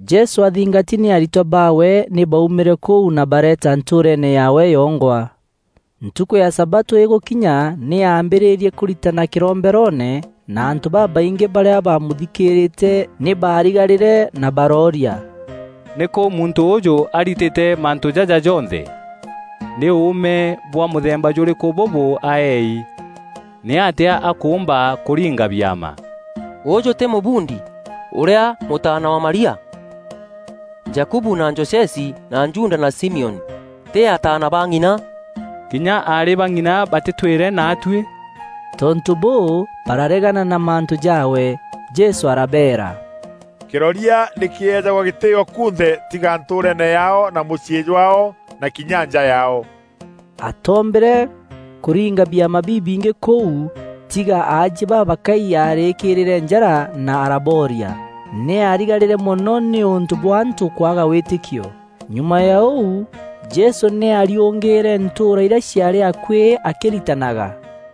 Jesû athingati nî aritwa baawe nî baaumîre kûu na bareeta ntûûreene yaawe yongwa. Ntukû ya sabatû îgûkinya nî aambîrîrie kûritana kîromberoone na antû babaingî barîa bamûthikîîrîte nî baarigarîre na barooria, “Nîkû muntû ûûjû aritîte mantû jaja jonthe? Nî ûûme bwa mûthemba jûrîkû bûbû aeei? Nîatîa akûûmba kûringa biama? Ûjû tî mûbundi, ûrîa mûtaana wa Maria? Jakubu na Josesi na Juda na Simioni tî ataana ba ng'ina? Kinya aarî ba ng'ina batîtwîre naatuî?” Tontû bûû, bararegana na mantû jaawe. Jesû arabeera, “Kîroria nî kîejagwa gîtîîo kunthe tiga ntûûreene yaao na mûciî jwaao na kinya nja yaao.” Atoombîre kûringa biama bibingî kûu tiga aajie babakai arîkîrîire njara na arabooria. Nî aarigarîre mono nîûntû bwa antû kwaga wîtîkio. Nyuma ya ûu Jesû nî aariûngîîre ntûûra irîa ciaarî akuî akîritanaga.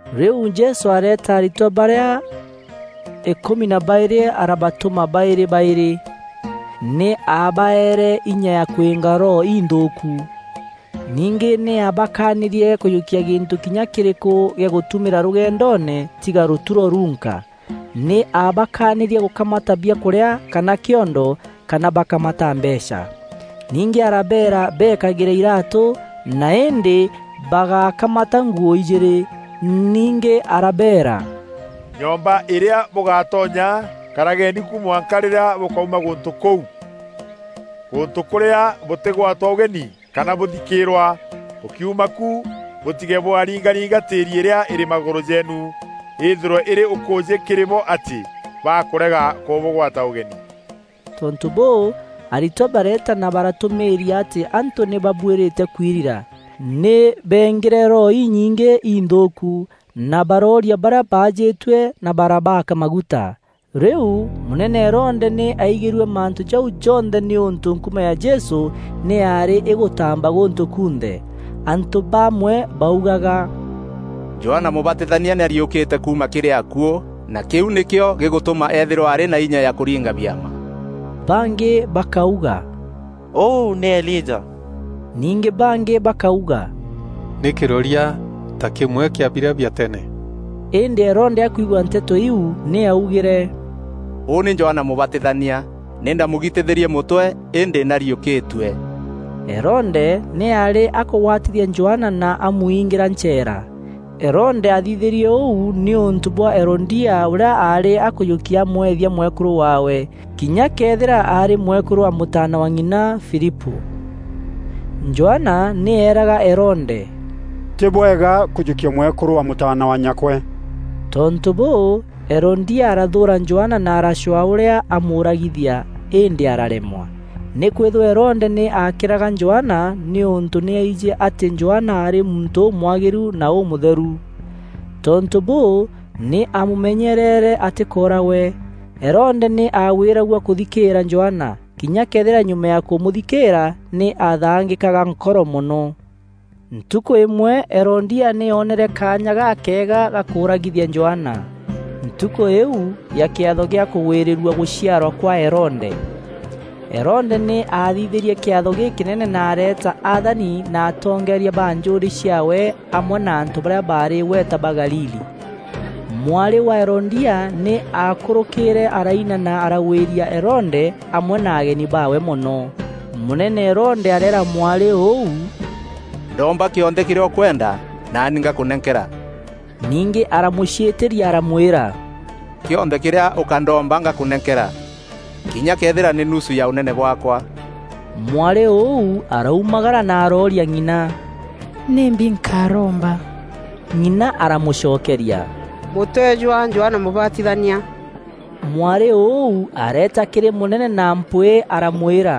Rîu Jesû areeta aritwa barîa îkûmi na baîrî arabatûma baîrî baîrî. Nî aabaeere inya ya kwînga roho inthûûku. Ningî nî aabakaanîrie kûjûkia gîntû kinya kîrîkû gîa gûtumîra rûgendoone tiga rûturo runka. Nî aabakaanîrie gûkamata biakûrîa, kana kîondo kana bakamata mbeecha. Ningî arabeera beekagîre iraatû, na îndî bagákamata nguû ijîîrî. Ningî arabeera, “Nyomba îrîa bûgatonya, karageni ku mwanka rîrîa bûkauma gûntû kûu. Gûntû kûrîa bûtîgwatwa ûgeni kana bûthikîîrwa, bûkiuma ku, bûtige bwaringaringa tîîri îrîa îrî magûrû jeenu, îthîrwe îrî ûkûûjî kîrî bo atî bakûrega kûbûgwata ûgeni.” Tontû bûû, aritwa bareeta na baratûmîîria atî antû nî babuîrîte kwirira. Nî beengîre roho inyingî inthûûku, na barooria barîa baajîtue na barabaaka maguta. Rîu mûnene Herode nî aigîrue mantû jau jonthe nîûntû nkuma ya Jesû nî yaarî îgûtaamba gûntû kunthe. Antû bamwe baugaga, “Johana Mûbatithania nî ariûkîtue kuuma kîrî akuû na kîu nîkîo gîgûtûma eethîrwa arî na inya ya kûringa biama.” Bangî bakauga, “Ûu nî Elija.” Ningî bangî bakauga, “Nî kîroria, ta kîmwe kîa birîa bia tene.” Îndî Herode akwigua nteto iu nî aaugîre, “Ûu nî Johana Mûbatithania! Nî ndaamûgitithîrie mûtwe îndî nî ariûkîtue.” Herode nî aarî akûgwatithia Johana na amwiingîra ncheera. Herode aathithîrie ûu nîûntû bwa Herodia, ûrîa aarî akûjûkia amwethia mwekûrû waawe, kinya këethîra aarî mwekûrû wa mûtaana wa ng'ina, Filipû. Johana nî eeraga Herode, “Tî bwega kûjûkia mwekûrû wa mûtaana wa nyakwe.” Tontû bûû, Herodia arathûûra Johana na aracwaa ûrîa amûûragithia, îndî araremwa, nîkwîthîrwa Herode nî aakîraga Johana nîûntû nî aijî atî Johana aarî muntû ûmwagîru na ûmûtheru. Tontû bûû, nî aamûmenyerere atîkooragwe. Herode nî aagwîragua kûthikîîra Johana, kinya këethîra nyuma ya kûmûthikîîra nî aathangîkaga nkoro mono. Ntukû îmwe, Herodia nî oonere kaanya gakega ga kûûragithia Johana. Ntukû îîu ya kîatho gîa kûgwîrîrua gûciarwa kwa Herode. Herode nî aathithîrie kîatho gîkînene na areeta athani na atongeeria ba njûûrî ciaawe amwe na antû barîa baarî îgweta ba Galili. Mwarî wa Herodia nî aakûrûkîre araina na aragwîria Herode amwe na ageni baawe mono. Mûnene Herode areera mwarî ûu, “Ndoomba kîonthe kîrîa ûkwenda naani ngakûnenkera.” Ningî aramûciîtîria aramwîra, “Kîonthe kîrîa ûkandoomba, ngakûnenkera, kinya këethîra nî nusu ya ûnene bwaakwa.” Mwarî ûu araumagara na arooria ng'ina, “Nîmbi nkaromba?” Ng'ina aramûcokeria, “Mûtwe jwa Johana Mûbatithania.” Mwarî ûu areeta kîrî mûnene na mpwîî aramwîra,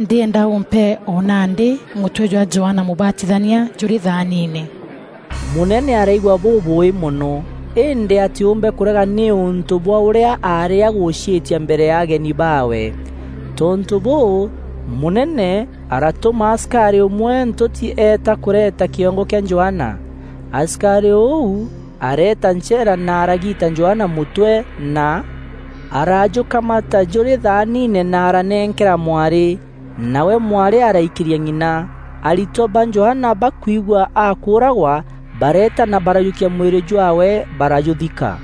“Ndîenda ûmpe o nandî mûtwe jwa Johana Mûbatithania jûrî thaaniine.” Mûnene araigua bûbûûî mono, îndî atîûmbe kûrega nîûntû bwa ûrîa aarî agûciîtia mbere ya ageni baawe. Tontû bûû, mûnene aratûma asikarî ûmwe ntûti eeta kûreta kîongo kîa Johana. Asikarî ûu areeta ncheera na aragiita Johana mûtwe na arajûkamata jûrî thaaniine na aranenkera mwarî. Nawe mwarî araikîria ng'ina. Aritwa ba Johana bakwigua akûûragwa, bareeta na barajûkia mwîrî jwaawe barajûthika.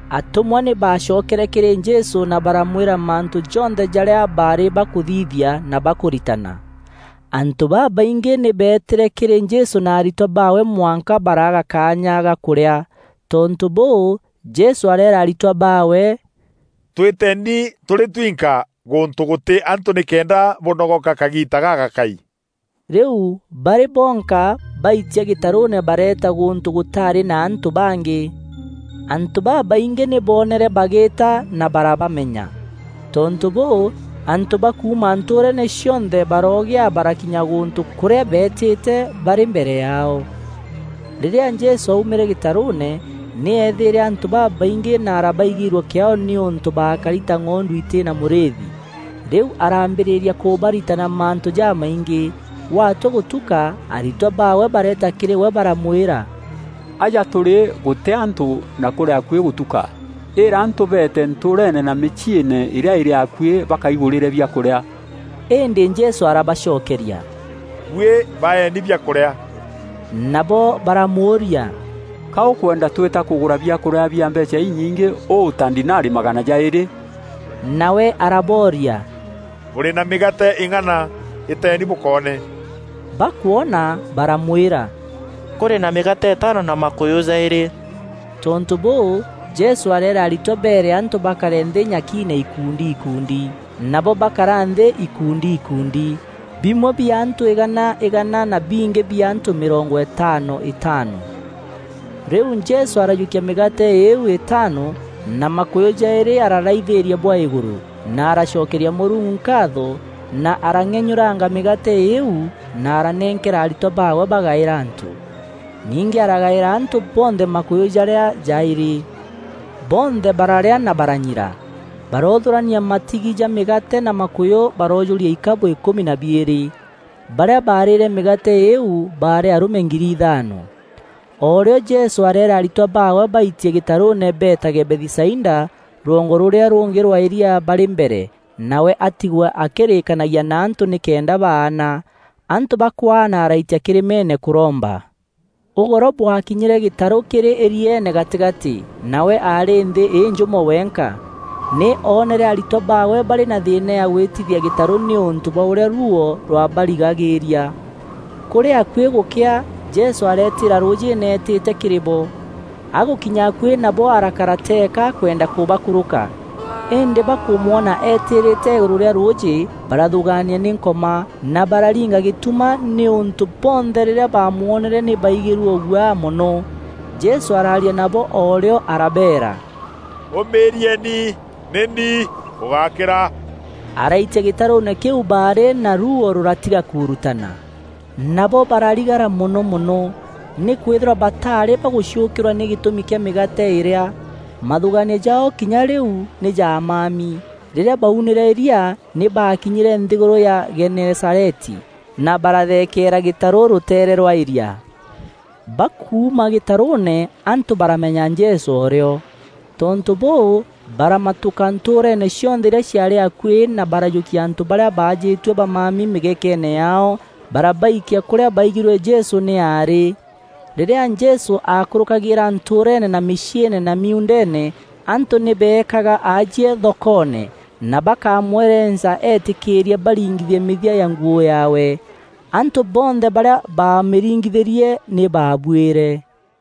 Atûmwa nî baacokere kîrî Jesû na baramwîra mantû jonthe jarîa baarî bakûthithia na bakûritana. Antû babaingî nî beetîre kîrî Jesû na aritwa baawe mwanka baraaga kaanya ga kûrîa. Tontû bûû, Jesû areera aritwa baawe, “Twîteni tûrî twinka gûntû gûtî antû nîkenda bûnogoka kagiita gagakai.” Rîu barî bonka baitia gîtarûûne bareeta gûntû gûtaarî na antû bangî. Antû babaingî nî boonere bagîîta, na barabamenya. Tontû bûû, antû ba kuuma ntûûreene cionthe baroogîa barakinya gûntû kûrîa beetîte barî mbere yaao. Rîrîa Jesû aumîre gîtarûûne, nî eethîîre antû babaingî na arabaigîîrua kîaao nîûntû baakari ta ng'ondu itî na mûrîîthi. Rîu araambîrîria kûbaritana mantû jamaingî. Gwatua gûtuka, aritwa baawe bareeta kîrî we baramwîra, “Aja tûrî gûtî antû na kûrî akuî gûtuka. Îîra antû beete ntûûreene na mîciîne îrîa îrî akuî, bakaigûrîre biakûrîa.” Îndî Jesû arabacokeria, “Buî baeni biakûrîa.” Nabo baramûûria, “Ka ûkwenda twîta kûgûra biakûrîa bia mbeecha inyingî ûu ta ndinari magana jaîrî?” Nawe arabooria, “Bûrî na mîgaate îng'ana? Îteeni bûkoone.” Bakwona, baramwîra, “Kûrî na mîgaate îtaano na makûyû jaîrî.” Tontû bûû, Jesû areera aritwa beere antû bakare nthî nyakiine ikundi ikundi. Nabo bakara nthî ikundi ikundi. Bimwe bia antû îgana îgana na bingî bia antû mîrongo îtaano îtaano. Rîu Jesû arajûkia mîgaate îîu îtaano na makûyû jaîrî araraithîîria bwa îgûrû, na aracokeria Mûrungu nkaatho, na arang'enyûranga mîgaate îîu na aranenkera aritwa baawe bagaîra antû. Ningî aragaîra antû bonthe makûyû jarîa jaîrî. Bonthe bararîa na baranyira. Baroothûrania matigi ja mîgaate na makûyû, baroojûria ikabû îkûmi na biîrî. Barîa baarîîre mîgaate îîu baarî arûme ngiri ithaano. O rîo Jesû areera aritwa baawe baitie gîtarûûne beetage Bethisaida, rwongo rûrîa rûngî rwa îria barî mbere, nawe atigwe akîrîîkanagia na antû nîkenda baana. Antû bakwaana araitia kîrîmeene kûromba. Ûgoro bwakinyîre gîtarû kîrî îrieene gatîgatî, nawe aarî nthî înjûmo wenka. Nî oonere aritwa baawe barî na thîîna ya gwîtithia gîtarû nîûntû bwa ûrîa ruuo rwabarigagîîria. Kûrî akuî gûkea, Jesû areetîîra rûûjîîne eetîte kîrî bo. Agûkinya akuî nabo arakara teeka akwenda kûbakûrûka. Îndî bakûmwona eetîrîte îgûrû rîa rûûjî, barathûgaania nî Nkoma, na bararinga gîtuma, nîûntû bonthe rîrîa baamwonere nî baigîrue ûguaa mono. Jesû araaria nabo o rîo, arabeera, “Ûmîîrieni, nî ni! Bûgákîra!” Araitia gîtarûûne kîu baarî, na ruuo rûratiga kuurutana. Nabo bararigara mono mono. Nîkwîthîrwa bataarî baguciûkîrwa nî gîtûmi kîa mîgaate îrîa. Mathûgaanio jaao kinya rîu nî jamami. Rîrîa baunîre îria, nî baakînyîre nthîgûrû ya Genesareti na barathekeera gîtarû rûteere rwa îria. Bakuuma gîtarûûne, antû baramenya Jesû o rîo. Tontû bûû, baramatûka ntûûreene cionthe irîa ciaarî akuî na barajûkia antû barîa baajîtue bamami mîgekeene yaao barabaikia kûrîa baigîrue Jesû nî aarî. Rîrîa Jesû aakûrûkagîîra ntûûreene na mîciîne na miuundeene, antû nî beekaga aajie thokoone, na bakamwerenca eetîkîîrie baringithie mîthia ya nguû yaawe. Antû bonthe barîa baamîringithîrie nî baabuîre.